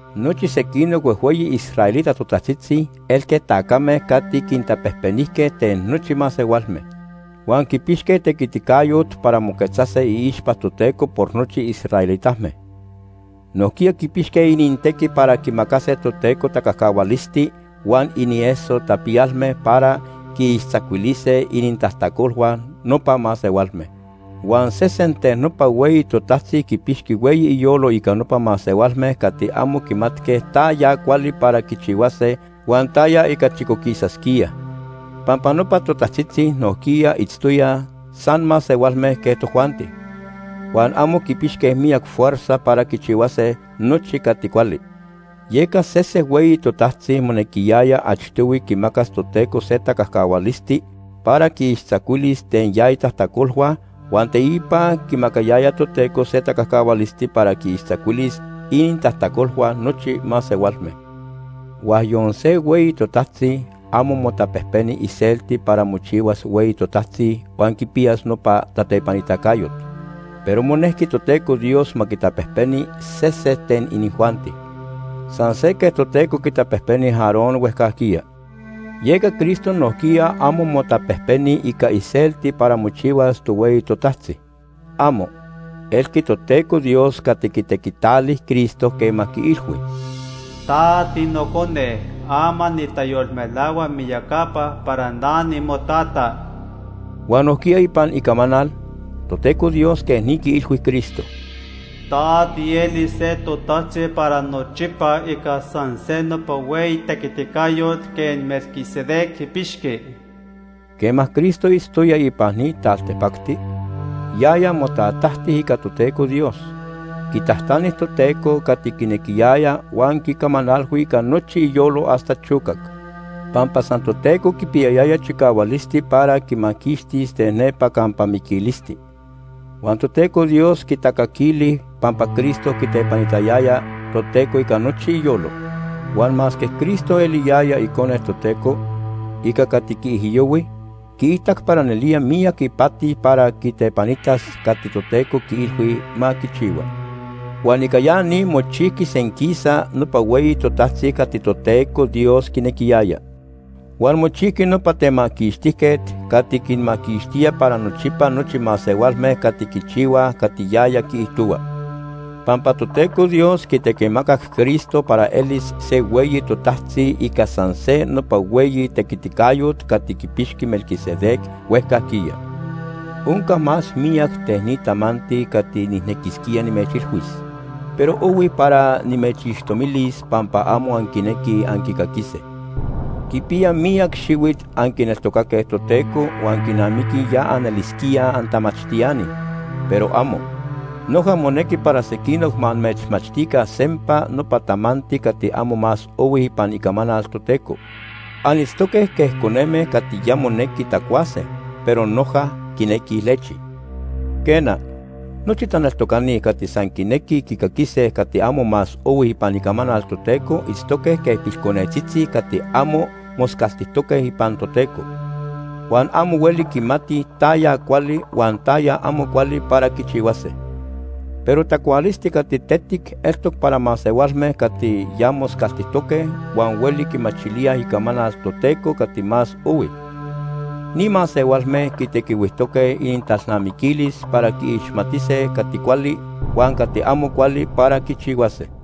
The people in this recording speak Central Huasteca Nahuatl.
Nochi sequinoc huejhueyi israelita totajtzitzi elque tacame cati quintapejpenijque ten nochi masehualme. Huan quipixque tequiticayot para moquetzase iixpa Toteco por nochi israelitame. Nojquiya quipixque inintequi para quimacase Toteco tacajcahualisti huan inieso tapiyalme para quiixtzacuilise inintajtacolhua nopa masehualme. Huan sesen ten nopa hueyi totajtzi quipixqui hueyi iyolo ica nopa masehualme cati amo quimatque taya cuali para quichihuase huan taya ica chicoquisasquíaj. Pampa nopa totajtzitzi nojquiya itztoyaj san masehualme quej tojuanti, huan amo quipixque miyac fuerza para quichihuase nochi cati cuali. Yeca sese hueyi totajtzi monequiyaya achtohui quimacas Toteco se tacajcahualisti para quiixtzacuilis ten ya itajtacolhua huan teipa quimacayaya Toteco se tacajcahualisti para quiixtzacuilis inintajtacolhua nochi masehualme. Huan yon se hueyi totajtzi amo motapejpeni iselti para mochihuas hueyi totajtzi huan quipiyas nopa tatepanitacayot, pero monejqui Toteco Dios ma quitapejpeni sese ten inijuanti, san se quej Toteco quitapejpeni Aarón huejcajquiya. Yeca Cristo nojquiya amo motapejpeni ica iselti para mochihuas tohueyi totajtzi. ¡Amo! Elqui Toteco Dios cati quitequitali Cristo quema quiilhui: “Ta tiNocone. Ama nitayolmelahua miyacapa para na nimoTata.” Huan nojquiya ipan Icamanal, Toteco Dios quej ni quiilhui Cristo: “Ta tielis se totajtzi para nochipa ica san se nopa hueyi tequiticayot quej Melquisedec quipixqui.” Quema Cristo itztoya ipan ni taltipacti, yaya motatajti ica Toteco Dios. Quitajtani Toteco cati quinequiyaya huan quicamanalhui ica nochi iyolo hasta chocac. Pampa san Toteco quipiyayaya chicahualisti para quimaquixtis ten nepa campa miquilisti. Huan Toteco Dios quitacaquili pampa Cristo quitepanitayaya Toteco ica nochi iyolo. Huan masque Cristo eliyaya Icone Toteco, ica cati quiijyohui, quiitac para nelía miyac ipati para quitepanitas cati Toteco quiilhui ma quichihua. Huan ica ya ni mochijqui senquisa nopa hueyi totajtzi cati Toteco Dios quinequiyaya. Huan mochijqui nopa Temaquixtijquet cati quinmaquixtía para nochipa nochi masehualme cati quichihuaj cati yaya quiijtohua, pampa Toteco Dios quitequimacac Cristo para elis se hueyi totajtzi ica san se nopa hueyi tequiticayot cati quipixqui Melquisedec huejcajquiya. Onca más miyac ten ni tamanti cati nijnequisquía nimechilhuis, pero ohui para nimechixtomilis pampa amo anquinequij anquicaquise. Quipiya miyac xihuit anquineltocaque Toteco huan quinamiqui ya anelisquíaj antamachtiani, pero amo. Noja monequi para sequinoc ma amechmachtica sempa nopa tamanti cati amo más ohui ipan Icamanal Toteco. Anitztoque quej coneme cati ya monequi tacuase, pero noja quinequij lechi. Quena, nochi taneltocani cati san quinequij quicaquise cati amo más ohui ipan Icamanal Toteco itztoque quej pilconetzitzi cati amo moscaltijtoque ipan Toteco, huan amo hueli quimatij taya cuali huan taya amo cuali para quichihuase. Pero tacualisti cati tetic eltoc para masehualme cati ya moscaltijtoque huan hueli quimachilíaj Icamanal Toteco cati más ohui. Ni masehualme quitequihuijtoque inintalnamiquilis para quiixmatise cati cuali huan cati amo cuali para quichihuase.